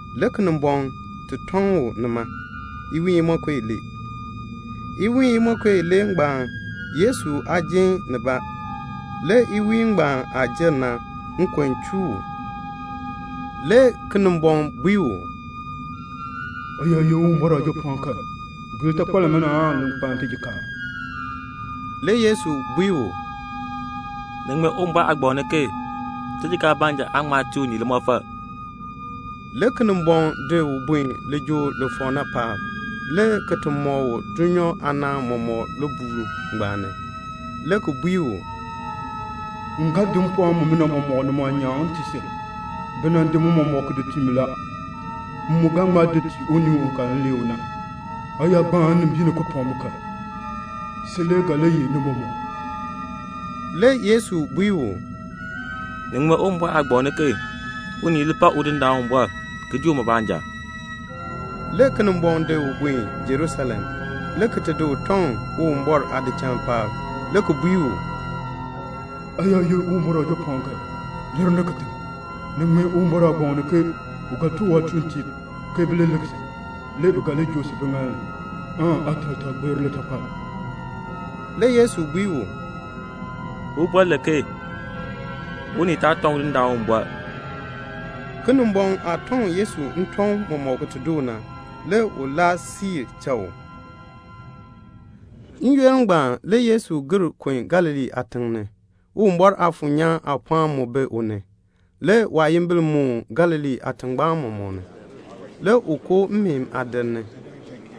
Le Kinimbɔŋ tɔŋ u nima, iwiin imonko ilee. Iwiin imonko ilee ngbaan Yesu aa jin nibaa. Le iwiin ngbaan aah jer na, nkon chuu u. Le Kinimbɔŋ bui u, "Aa yaa ye Uwumbɔr Aajapɔɔn kan, bui litakpal limina li kpaln tijikaar." Le Yesu bui u, "Ni ŋmee Uwumbɔr aagbaŋ ni ke 'Tijikaar baanja aan ŋma tii unii limɔfal."' Le Kinimbɔŋ di u buen lijool li fɔk na paab, le ki mɔk u dulnyaa aanaan mɔmɔk libuul ngbaan ni, le ki bui u, "M ga tii si mpɔɔn mumina mɔmɔk ni mu aanyaan. Bi nan di ni mɔmɔk ki tii mi. M mu ga di ni ki tii unii u m lee u na. Aa yaa gbaan nnimbiin ni ki pak mi kan, sin le ga li yeh ni mɔmɔk." Le Yesu bui u, "Ni ŋmee Uwumbɔr aagbaŋ ni ke, 'Unii li pak Udindaan Uwumbɔr ki dii uma baanja."' Le Kinimbɔŋ di u di buen Jerusalem, le ki di u tɔŋ Uwumbɔr aadichal paab, le ki bui u, "Aa yaa ye Uwumbɔr Aajapɔɔn kan, lir ni kitiŋ; ni ŋmee Uwumbɔr aagbaŋ ni ke 'U ga tuk waatuuntiib ke bi li lik si. Le bi ga li joo si biŋaal ni, aataal taa gbeer litakpal."' Le Yesu bui u, "Uwumbɔr len ke 'Unii taa tɔŋ Udindaan Uwumbɔr."' Kinimbɔŋ aah tɔŋ Yesu ntɔŋ mɔmɔk ki doo na, le u siir cha u n-yoonn siib. N-yoonn ngbaan le Yesu gir kun Galilee aatiŋ ni. Uwumbɔr Aafuur nyaan aapɔɔn mu bi u ni. Le waayimbil moon Galilee aatingbaan mɔmɔk ni. Le u koo mmeen aadir ni,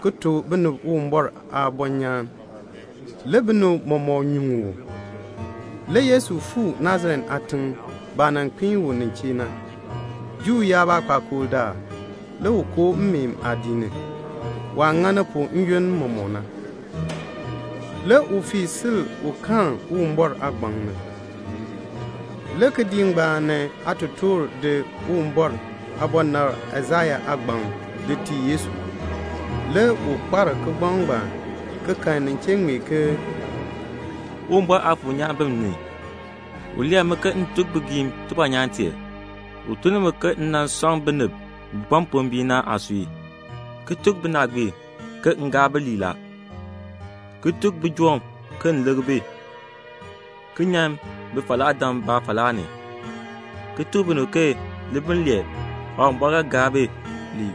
ki tuk binib Uwumbɔr aabɔnyaan. Le binib mɔmɔk nyuŋ u. Le Yesu fuu Nasaret aatiŋ, baah nan kpiin u nin chee na. Juu yaab aakpakool daal, le u koo mmeen aadiik ni, waah ŋani pu n-yoonn mɔmɔk na. Le u fii sil un karn Uwumbɔr aagbaŋ ni. Le kidiik ni aatotoor di Uwumbɔr aabɔnabr Aisaya aagbaŋ ki di tii Yesu. Le u kpar kigbaŋ ngbaan, ki kan nin chee ŋmee ke "Tidindaan Uwumbɔr Aafuur nyaan bi m ni; u lee mi ke m tuk bigiim tibɔnyaan tee. U tun ni mi ke m sɔŋ binib bi kpa mpombiin na aasui, ki tuk binaagbiib ke m gaa bi lii la, ki tuk bijoom ke m likr bi, ki nyan bifalaadam baafalaa ni, ki tuk binib ke libiln lee Tidindaan Uwumbɔr ga gaa bi lii."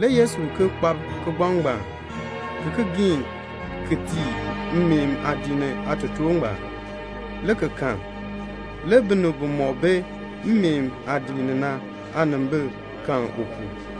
Le Yesu ki kpab kigbaŋ ngbaan, ki ki giin ki di tii mmeen aadiik ni aatotoor ngbaan, le ki kal. Le binib bimɔk bi mmeen aadiik ni na aanimbil kal u pu.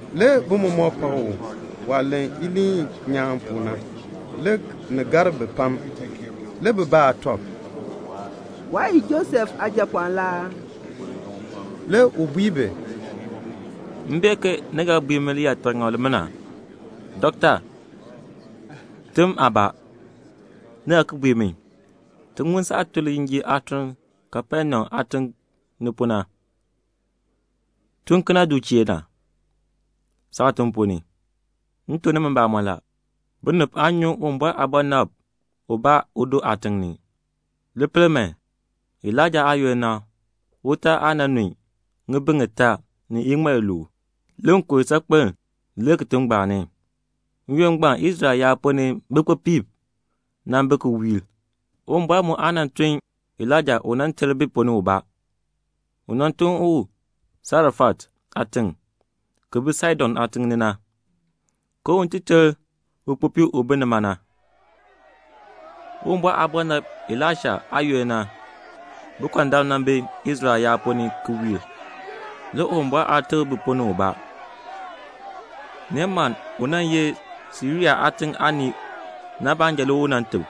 Le bi mɔmɔk pak u. Waah len iliin nyaan pu na, le ni gar bi pam. Le bi baa tɔb, "Waa ye Josef aajapɔɔn la aa?" Le u bui bi, "M bee ke ni ga bui mi liyaataŋakl limina, 'Dɔkta, tem aabaa.' Ni ga ki bui mi, 'Ti ŋun saah tun lijinjiir aatun Kapenaum aatiŋ ni pu na. Tun kena du chee na, saatiŋ ponn ni.' M tuk nimi mbamɔn la, binib aan nyuŋ Uwumbɔr aabɔnabr ubaa udo aatiŋ ni. Li pel man, Elaija aayoonn, utaal aa nan nun ŋibin ŋitaa ni iŋmal iluub. Le nkon saakpem lir kitiŋ ngbaan ni. N-yoonn ngbaan Israel yaab ponn ni bikpopiib nan bi ki wiir. Uwumbɔr mu aa tun Elaija un ti ter bi ponn ni ubaa. U tun u Sarefat aatiŋ, ki bi Saidon aatiŋ ni na, un ti ter ukpopii u bi nima na. Uwumbɔr aabɔnabr Elaisha aayoonn, bikɔndam nan bi Israel yaab ponn ni ki wiir; le Uwumbɔr aa teb bi ponn ni ubaa. Neemann, u nan ye Siria aatiŋ aanii na baanja le u teb."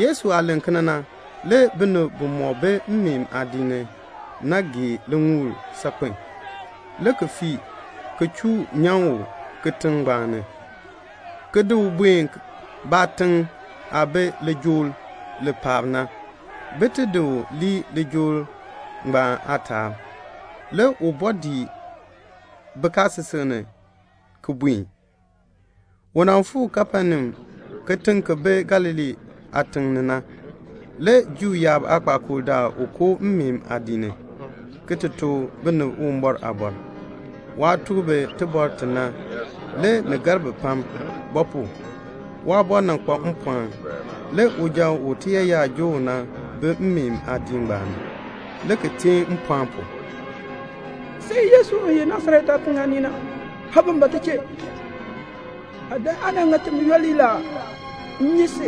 Yesu aah len kena na, le binib bimɔk bi mmeen aadiik ni na gee liŋuul saakpen a, le ki fii, ki chuu nyan u kitiŋ ngbaan ni, ki di u buen baatiŋ aah bi lijool li paab na, bin ti di u lii lijool aataab. Le u bɔɔ dii bikaasisik ni le ki buen. Le u fuu Kapenaum, kitiŋ ki bi Galilee aatiŋ ni na. Le Juu yaab aakpakool daal u koo mmeen aadiik ni, ki tuk binib Uwumbɔr aaliin. Waah tuk bi iliin i na, le ni gar bi pam. Ba pu? waaliin kpa mpɔɔn. Le uja u tiyaayar joo u na bi mmeen aadiik ngbaan ni, le ki teen mpɔɔn pu, "Sin Yesu u ye Nasaret aatiŋ aanii na, aa ban ba ti chee? Aa dan aa nan ŋa timi yooli la aa? M nyi si.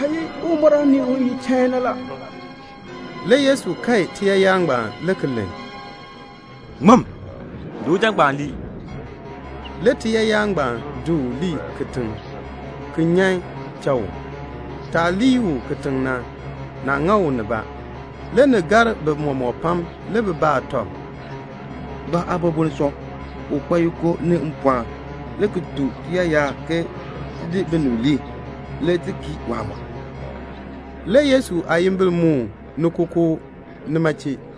Aa ye Uwumbɔr aanii u ye chain na la." Le Yesu kae tiyaayar ngbaan, le ki len, "Ŋmim. Di uja ngbaan lii." Le tiyaayar ngbaan di u lii kitiŋ, ki nyan cha u. Taah lii u kitiŋ na, naa ŋa u nibaa. Le ni gar bi mɔmɔk pam. Le bi baa tɔb, "Ba aaliin boln sɔ? U kpa yiko ni mpɔɔn le ki tuk tiyaayar ke ti di binib lii. Le ti kii waamɔb." Le Yesu aayimbil moon ni kookoo nima chee.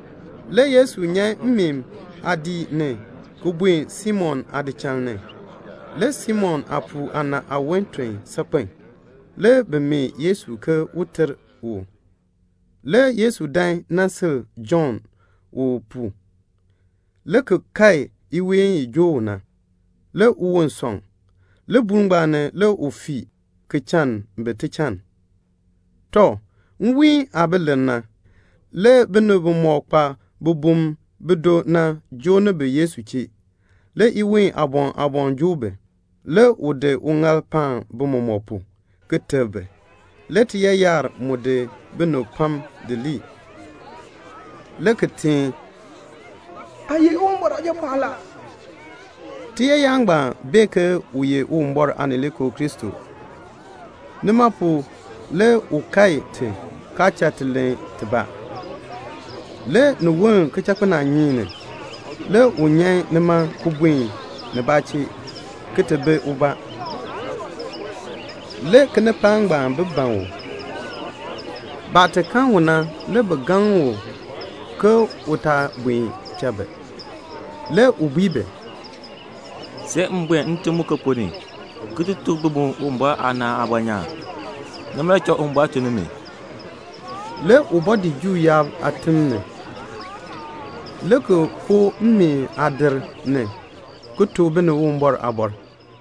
Le Yesu nyan mmeen aadiik ni, le ki buen Simon aadichal ni. Le Simon aapuu aana aawon ton saakpen a. Le bi mee Yesu ke un ter u. Le Yesu dan nan sil jon u pu, le ki kae iween i joo u na. Le uwon sɔŋ. Libuul ngbaan ni le u fii, le ki chann bi tichann. Tɔ, nwiin aah bi lir na, le binib bimɔk kpa bibum bido na, bi joo ni bi Yesu chee. Le iween aaboŋ aaboŋ joo bi. Le u di uŋaal paan bi mɔmɔk pu, ki teb bi. Le tiyaayar mu di binib pam di lii, le ki teen, "Aa ye Uwumbɔr Aajapɔɔn la." Tiyaayar ngbaan bee ke u ye Uwumbɔr Aanileekoo Kristo. Nima pu na le u kae ti, kaa cha ti len tibaa. Le ni woln kichakpinaanyeek ni, le u nyan nima, ki buen nibaa chee, ki ti bi ubaa. Le kinipaak ngbaan bi ban u. Baah kan u na, le bi gaŋ u ke u taa buen cha bi. Le u bui bi, "See m buen ntim muken ponn ni, ki ti tuk bi mu Uwumbɔr aanaan aabɔnyaan. Nima le cha Uwumbɔr tun ni mi." Le u bɔɔ dii Juu yaab aatim ni, le ki koo mmeen aadir ni, ki tuk binib Uwumbɔr aaliin.